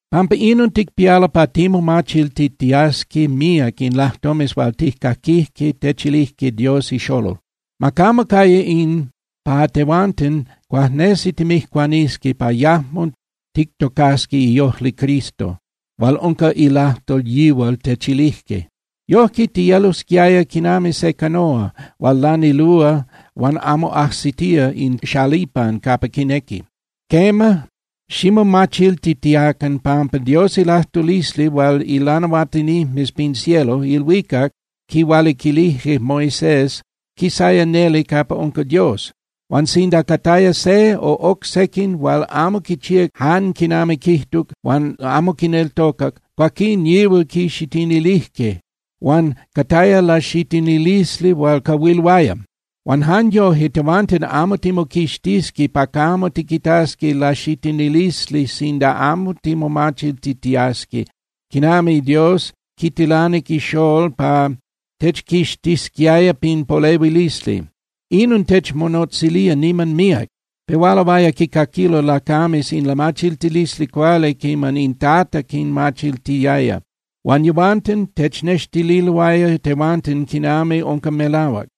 Pampa inon ticpialo pa timomachiltitiasqui míac in lajtomes hual tijcaquijque techilijque Dios iXolol. Ma camo caya in pa tehuanten cuajnesi timijcuanisqui pa yajmo tictocasqui iojli Cristo hual unca ilajtol yihual techilijque. Yojque tiyelosquiaya quinami se canóa hual lanilúa huan amo ajsitía in xalipan capa quinequi. Quema, ximomachiltitiacan, pampa Dios ilajtulisli hual ilanahuatinijmes pin cielo (ilhuicac) quihualiquilijque Moisés quisaya neli capa unca Dios. Huan sinda cataya se o oc sequin hual amo quichíac jan quinami quijtuc huan amo quineltocac, cuaquín yihual quixitinilijque, huan cataya laxitinilisli hual cahuiluaya. Huan jan yoje, tehuanten amo timoquixtisqui pa camo tiquitasqui laxitinilisli sinda amo timomachiltitiasqui quinami Dios quitilanic ixolol pa techquixtisquiaya pin polehuilisli. ¡Inon techmonotzilía niman míac! Pehualoaya quicaquilo lacames in lamachiltilisli cuali quiman in Tata quinmachiltiaya, huan yehuanten technextililoaya tehuanten quinami unca melahuac.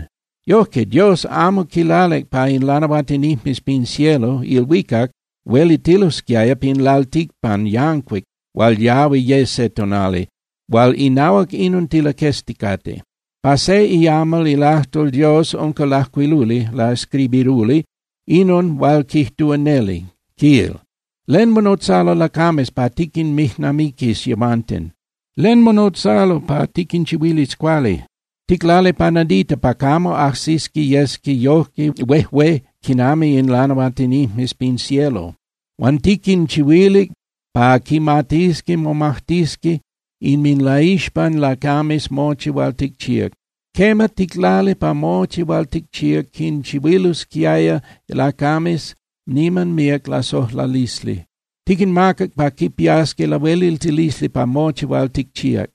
Yojque, Dios amo quilalic pa in lanahuatinijmes pin cielo (ilhuicac) huelitilosquiaya pin lalticpan yancuic hual yahui ye se tonali, hual inahuac inon tilaquezticate. Pa se iamal ilajtol Dios unca lajcuiluli (laescribiruli) inon hual quijtúa neli, quil: ¿Len monotzalo lacames pa tiquinmijnamiquis yehuanten? ¿Len monotzalo pa tiquinchihuilis cuali? Ticlalic pa nadita pa camo ajsisqui yesqui yojque huejué quinami in lanahuatinijmes pin cielo. Huan tiquinchihuilic pa quimatisqui momajtisqui inminlaixpan lacames mochi hual ticchíac. Quema, ticlalic pa mochi hual ticchíac quinchihuilisquiaya lacames niman míac lasojlalisli. Tiquinmacac pa quipiasqui lahueliltilisli pa mochi hual ticchíac.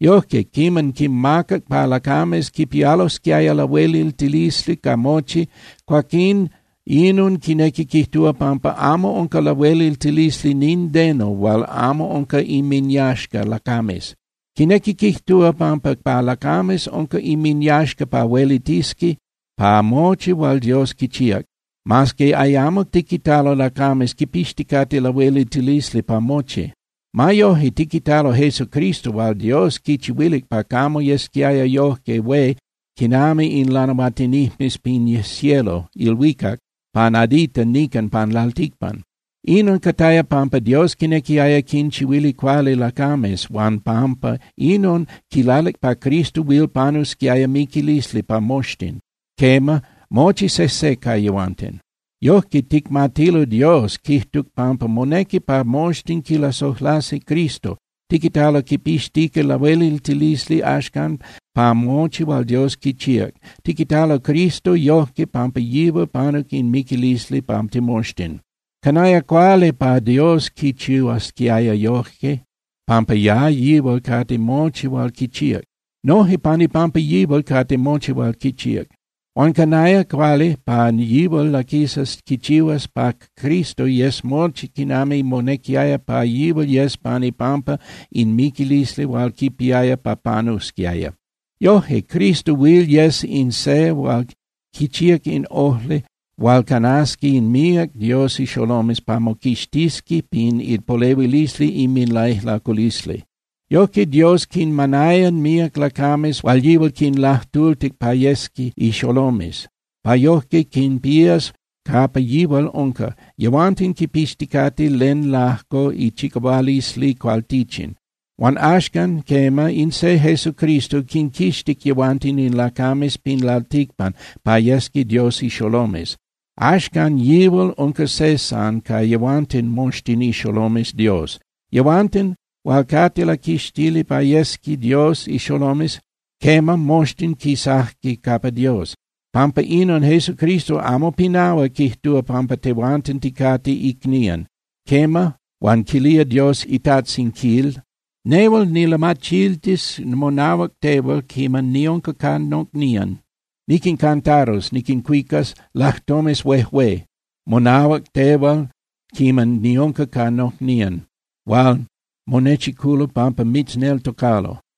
Yojque, quiman quimacac pa lacames quipialosquiaya lahueliltilisli ca mochi, cuaquín inon quinequi quijtúa pampa amo unca lahueliltilisli nindeno hual amo unca inminyaxca lacames. Quinequi quijtúa pampa pa lacames unca inminyaxca pa huelitisqui pa mochi hual Dios quichíac, mas que ayamo tiquitalo lacames quipixticate lahueliltilisli pa mochi. Ma yoje, tiquitalo Jesucristo hual Dios quichihuilic pa camo yesquiaya yojque hué quinami in lanahuatinijmes pin cielo (ilhuicac) pa nadita nican pan lalticpan. Inon cataya pampa Dios quinequiaya quinchihuili cuali lacames, huan pampa inon, quilalic pa Cristo huil panusquiaya miquilisli pa moxtin, quema, mochi sejse ca yehuanten. Yojque ticmatilo Dios quijtuc pampa monequi pa moxtin quilasojlasi Cristo. Tiquitalo quipixtica lahueliltilisli axcan pa mochi hual Dios quichíac. Tiquitalo Cristo yojque pampa yihual panuc in miquilisli pa timoxtin. Canaya cuali pa Dios quichihuasquiaya yoje, pampa pa yihual cate mochi hual quichíac. Noje pan ipampa yihual cate mochi hual quichíac. Huan canaya cuali pa yihual laquisas quichihuas pa Cristo yes mochi quinami monequiaya pa yihual yes pan ipampa in miquilisli hual quipiaya pa panusquiaya. Yoje Cristo huil yes in se hual quichíac in ojli hual canasqui in míac Dios ixolomes pa moquixtisqui pin ipolehuilisli inminlaijlaculisli. Yojque Dios quinmanaya míac lacames hual yihual quinlajtultic pa yesqui ixolomes, pa yojque quinpías capa yihual unca, yehuanten quipixticate len lajco ichicahualisli cualtichin. Huan axcan, quema, in se Jesucristo quinquixtic yehuanten in lacames pin lalticpan pa yesqui Dios ixolomes. Axcan yihual unca se san ca yehuanten moxtin ixolomes Dios, yehuanten hual cate laquixtili pa yesqui Dios ixolomes. Quema, moxtin quisajque capa Dios. Pampa inon Jesucristo amo pinahua quijtúa pampa tehuanten ticate icnían. Quema, huan quilía Dios iTajtzin, quil: Nehual nilamachiltis monahuac tehual quiman niunca ca nocnían. Niquincantarus (niquincuicas) lajtomes huejué monahuac tehual quiman niunca ca nocnían hual monechiculo pampa mitzneltocalo.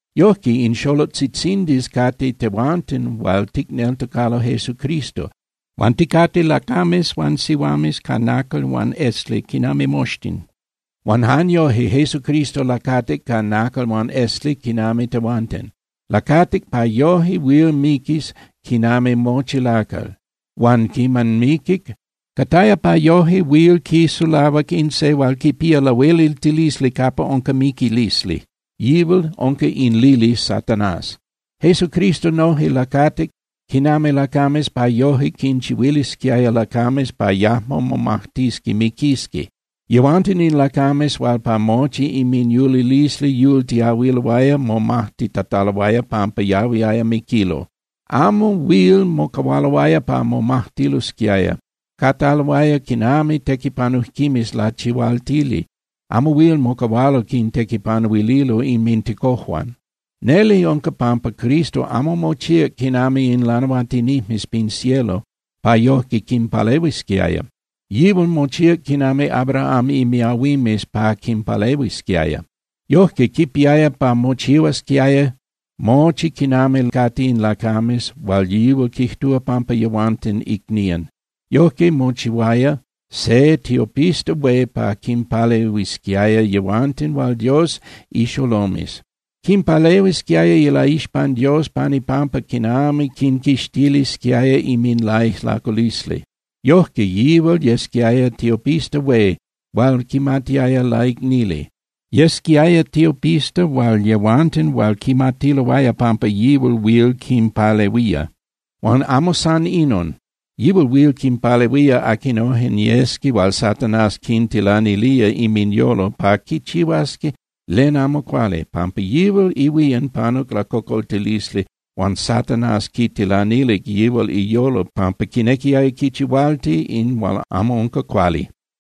Yojque, in xolotzitzindis cate tehuanten hual ticneltocalo Jesucristo, huan ticate lacames huan sihuames ca nacal huan esli quinami moxtin. Huan jan yoje, Jesucristo lacatic ca nacal huan esli quinami tehuanten. Lacatic pa yoje huil miquis quinami mochi lacal. Huan quiman miquic, cataya pa yoje huil quisulahuac in se hual quipía lahueliltilisli capa unca miquilisli. Yihual unca in lili Satanás. Jesucristo noje lacatic quinami lacames pa yoje quinchihuilisquiaya lacames pa yajmo momajtisqui miquisqui. Yehuanten in lacames hual pa mochi inminyulilisli yultiahuiloaya momajtitataloaya pampa yahuiloaya miquilo. Amo huil mocahualoaya pa momajtilosquiaya. Cataloaya quinami tequipanujquimes lachihualtili, amo huil mocahualo quintequipanuililo inmintecojuan. Neli unca pampa Cristo amo mochíac quinami in lanahuatinijmes pin cielo pa yojque quinpalehuisquiaya. Yihual mochíac quinami Abraham imiahuimes pa quinpalehuisquiaya. Yojque, quipiaya pa mochihuasquiaya mochi quinami cate in lacames hual yihual quijtúa pampa yehuanten icnían. Yojque mochihuaya se tiopista hué pa quinpalehuisquiaya yehuanten hual Dios ixolomes. Quinpalehuisquiaya ilaixpan Dios pan ipampa quinami quinquixtilisquiaya inminlaijlaculisli. Yojque yihual yesquiaya tiopista hué hual quimatiaya laicnili. Yesquiaya tiopista hual yehuanten huil quimatiloaya pampa yihual huil quinpalehuía. Huan amo san inon, yihual huil quinpalehuía aquinojen yesqui hual Satanás quintilanilía inminyolo pa quichihuasqui len amo cuali, pampa yihual ihuían panuc lacocoltilisli huan Satanás quitilanilic yihual iyolo pampa quinequiaya quichihualti in hual amo unca cuali.